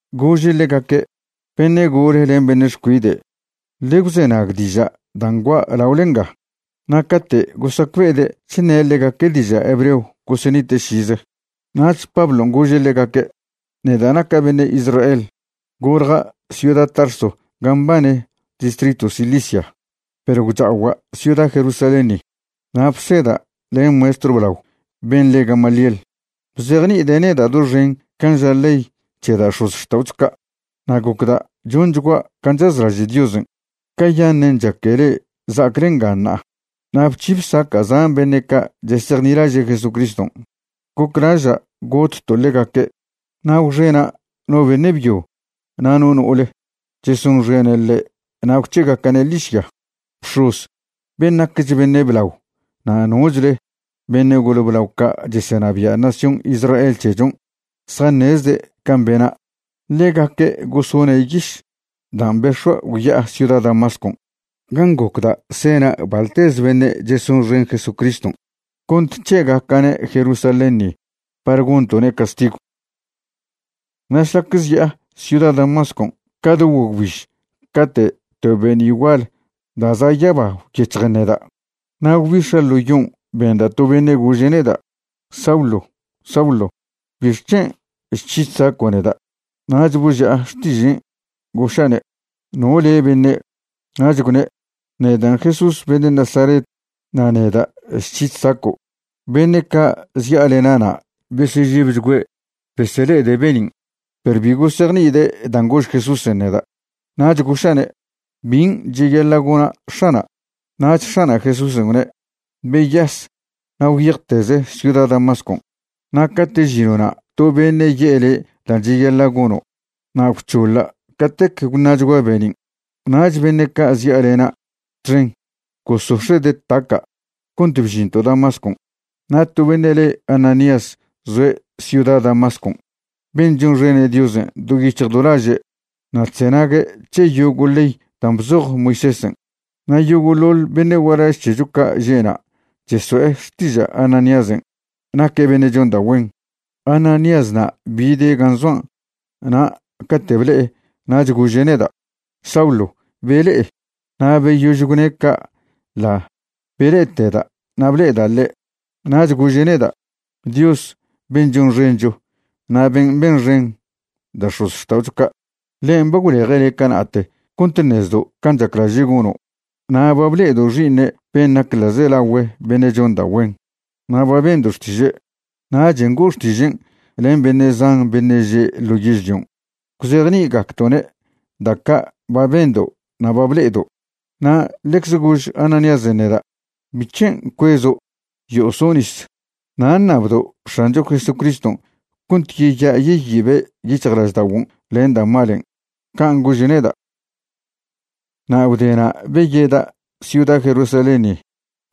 Gože' ḻegaque': ―Beṉe' gole len beṉe' xcuide', ḻe gwzenag diža' dan' gua' laole nga. Na' cate' gosacbe'ede' chṉe' ḻegaque' diža' hebreo gosenite' šize. Nach Pablon' gože' ḻegaque': ―Neda' naca' beṉe' Israel. Golja' ciuda Tarso gan' mbane distritw Cilicia, perw gwcha'ogua' ciuda Jerusalén ni. Na' bseda' len maestrw blao ben' le Gamaliel. Bzejni'ide' neda' doxen can' ža ley c̱he da' x̱ozxta'ocho ca'. Na' gocda' chonchgua' can' chazlaže' Diosen', cayaṉen' chaque le'e za'acle nga ṉa'a. Na' bc̱hi bsaca' zan beṉe' ca' chesejnilaže' Jesucriston', goclaža' gotto' ḻegaque'. Na' gwxena' no beṉe' byo na' no no'ole chesonxene' ḻe' na' gwc̱he'egaca'ne' ḻižya. Bx̱oz ben' naquech beṉe' blao na' nochle beṉe' gole blao ca' chesenabia' nación Israel c̱hechon' zjaṉezde' can' bena'. Ḻegaque' gosone' yiš dan' bex̱ua' gwya'a ciuda Damascon' gan' gocda' sena' baḻtez beṉe' chesonxen Jesucriston' cont c̱he'egaca'ne' Jerusalén ni par gonto'ne' castigw. ’Na' šlac zya'a ciuda Damascon' ca do guagwbiž cate' to be'ni' gual da' za' yaba gwyec̱hjen neda'. Na' gwbix̱a' ḻo yon' benda' to beṉe' gože' neda': “Saulo, Saulo ¿bixc̱hen' chc̱hi chsaco' neda'?” Nach boži'a xtižen', goša'ne': “¿No le' beṉe'?” Nach gwne': “Nedan' Jesús beṉe' Nazaret na' neda' chc̱hi chsaco'.” Beṉe' ca' zya'alena'na' besežebchgüe' besele'ede' be'nin', perw bi gosejni'ide' dan' gož Jesúsen' neda'. Nach goša'ne': “¿Bin' cheyaḻa' gona' X̱ana'?” Nach X̱ana' Jesúsen' gwne': “Beyas na' gwyejteze ciuda Damascon', na' cate' žino'na' to beṉe' ye'e le' dan' cheyaḻa' gono'.” Na' gwc̱hoḻa' catec gwṉa'chgua' be'nin', nach beṉe' ca' zya'alena' txen gosox̱e'de' taca' cont bžinto' Damascon'. ’Na' to beṉe' le Ananías zoe' ciuda Damascon' ben' chonxene' Diosen' do yic̱hj do laže' na' chzenague' c̱he yogo' ley dan' bzoj Moisésen'. Na' yogo'ḻoḻ beṉe' gualaž c̱hecho ca' že'na' cheso'e xtiža' Ananíasen' naque' beṉe' chon da' güen. Ananíasna' bide' gan' zoan' na' cate' ble'e nach gože' neda': “Saulo, bele'e.” Na' beyož gwne' ca' ḻa' bele'eteda' na' ble'eda' ḻe'. Nach gože' neda': “Dios ben' chonxencho na' ben' benxen da' x̱ozxta'ocho ca', ḻen' ba gwleje' le' cana'te cont ṉezdo' can' chaclaže' gono', na' ba ble'edo' Xi'iṉe' ben' nac ḻa'zelagüe beṉe' chon da' güen, na' ba bendo' xtiže'. Nachen' go'o xtižen' len beṉe' zan beṉe' že' ḻo yežlion' gwzejni'igacdo'ne' da' ca' ba bendo' na' ba ble'edo'.” Na' ḻecz gož Ananíasen' neda': “¿Bic̱hen' cuezo'? Yo'o so' nis. Na' ṉabdo' X̱ancho Jesucriston' cont yeya' yeyibe' yic̱hjlažda'oguon' len da' malen'.” Can' gože' neda'. ’Na' gwdena' beyeda' ciuda Jerusalén ni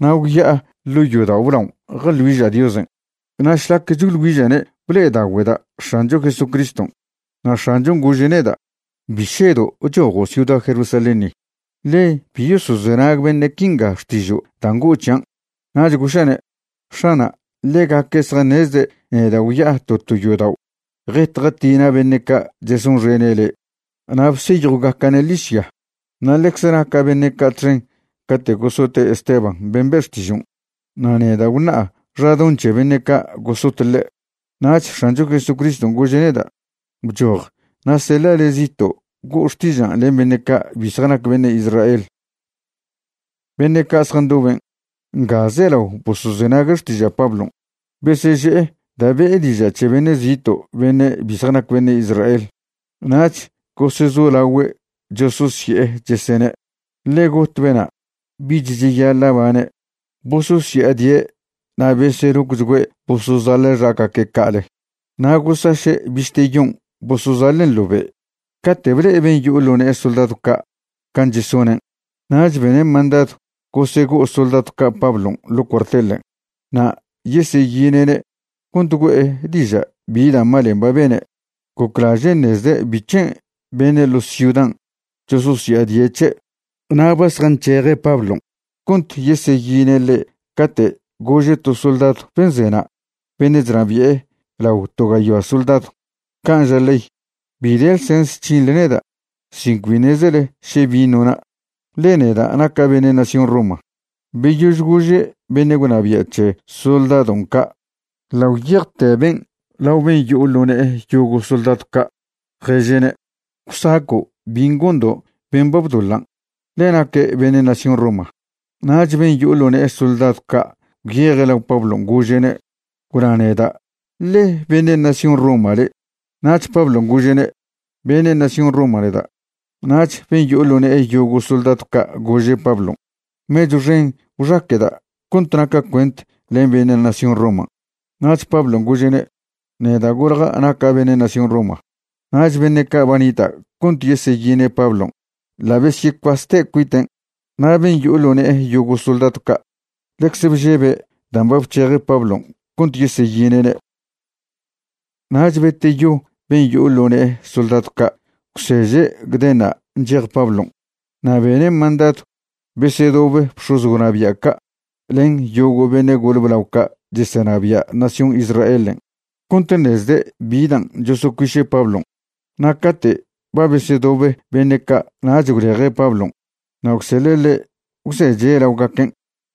na' gwya'a ḻo' yodao' blaon' jeḻ güiža' Diosen', na' šlac choḻ güiža'ne' ble'edagüeda' X̱ancho Jesucriston'. Na' X̱anchon' gože' neda': “Bi šedo' chojo' ciuda Jerusalén ni, ḻe bi yosozenag beṉe' quinga xtižo' dan' go'o c̱hian'.” Nach goša'ne': “X̱ana', ḻegaque' zjaṉezde' neda' gwya'a to to yodao' jet jatina' beṉe' ca' chesonxene' le' na' bseyjwgaca'ne' ḻižya. Na' ḻecz naca' beṉe' ca' txen cate' gosote' Esteban ben' be' xtižon', na' neda' gwṉa'a xadoṉ c̱he beṉe' ca' gosot ḻe'.” Nach X̱ancho Jesucriston' gože' neda': “Bchoj na' seḻa' le' zito' go'o xtižan' len beṉe' ca' bi zjanac beṉe' Israel.” Beṉe' ca' zjandoben', nga zelao bosozenague' xtiža' Pablon', beseže'e da' be'e diža' c̱he beṉe' zito' beṉe' bi zjanac beṉe' Israel, nach gosezolagüe' chososye'e, chesene': ―Ḻe got bena'. Bich cheyaḻa' bane'. Bososya'adie' na' beselocchgüe' bosozaḻa' xagaque' ca'ale na' gosaše' bište yon' bosozaḻen' ḻo be'. Cate' ble'e ben' yo'o ḻo ne'e soldadw ca' can' chesonen' nach bene' mandadw gosego'o soldadw ca' Pablon' ḻo' cuartelen' na' yeseyine'ne' cont güe'e diža' bi da' malen' ba bene'. Goclaže' ṉezde' bic̱hen' beṉe' ḻo ciudan' chososya'adie' c̱he'. Na' ba zjanc̱heje' Pablon' cont yeseyine' ḻe' cate' gože' to soldadw ben' zena' beṉe' chnabi'e ḻao to gayoa soldadw: ―Can' ža ley, bi de ḻsens c̱hinḻe neda' sin cbi ṉezele še bin' nona', ḻe neda' naca' beṉe' nación Roma. Beyož gože' beṉe' gwnabia' c̱he soldadon' ca' ḻa' gwyejte ben' lao ben' yo'o ḻo ne'e yogo' soldadw ca', ježe'ne': ―Gwsaco' bin' gondo' ben' ba bdoḻan', ḻe naque' beṉe' nación Roma. Nach ben' yo'o ḻo ne'e soldadw ca' gwyeje' lao Pablon' gože'ne': ―Gwna neda' ¿ḻe beṉe' nación Roma le'? Nach Pablon' gože'ne': ―Beṉe' nación Roma neda'. Nach ben' yo'o ḻo ne'e yogo' soldadw ca' gože' Pablon': ―Mechw xen gwxaqueda' cont naca' cuent len beṉe' nación Roman'. Nach Pablon' gože'ne': ―Neda' golja' naca' beṉe' nación Roma. Nach beṉe' ca' ba nita' cont yeseyine' Pablon' ḻa' besyecuaste' cuiten', na' ben' yo'o ḻo ne'e yogo' soldadw ca' ḻecze bžebe' dan' ba bc̱heje' Pablon' cont yeseyine'ne'. Nach beteyo ben' yo'o ḻo ne'e soldadw ca' gwseže' gdenṉa' nchej Pablon'. Na' bene' mandadw besedobe bx̱oz gwnabia' ca' len yogo' beṉe' gole blao ca' chesenabia' nación Israelen' cont ṉezde' bi dan' chosocuiše' Pablon'. Na' cate' ba besedobe beṉe' ca' nach gwleje' Pablon' na' gwseḻe' ḻe' gwzeche' laogaquen'.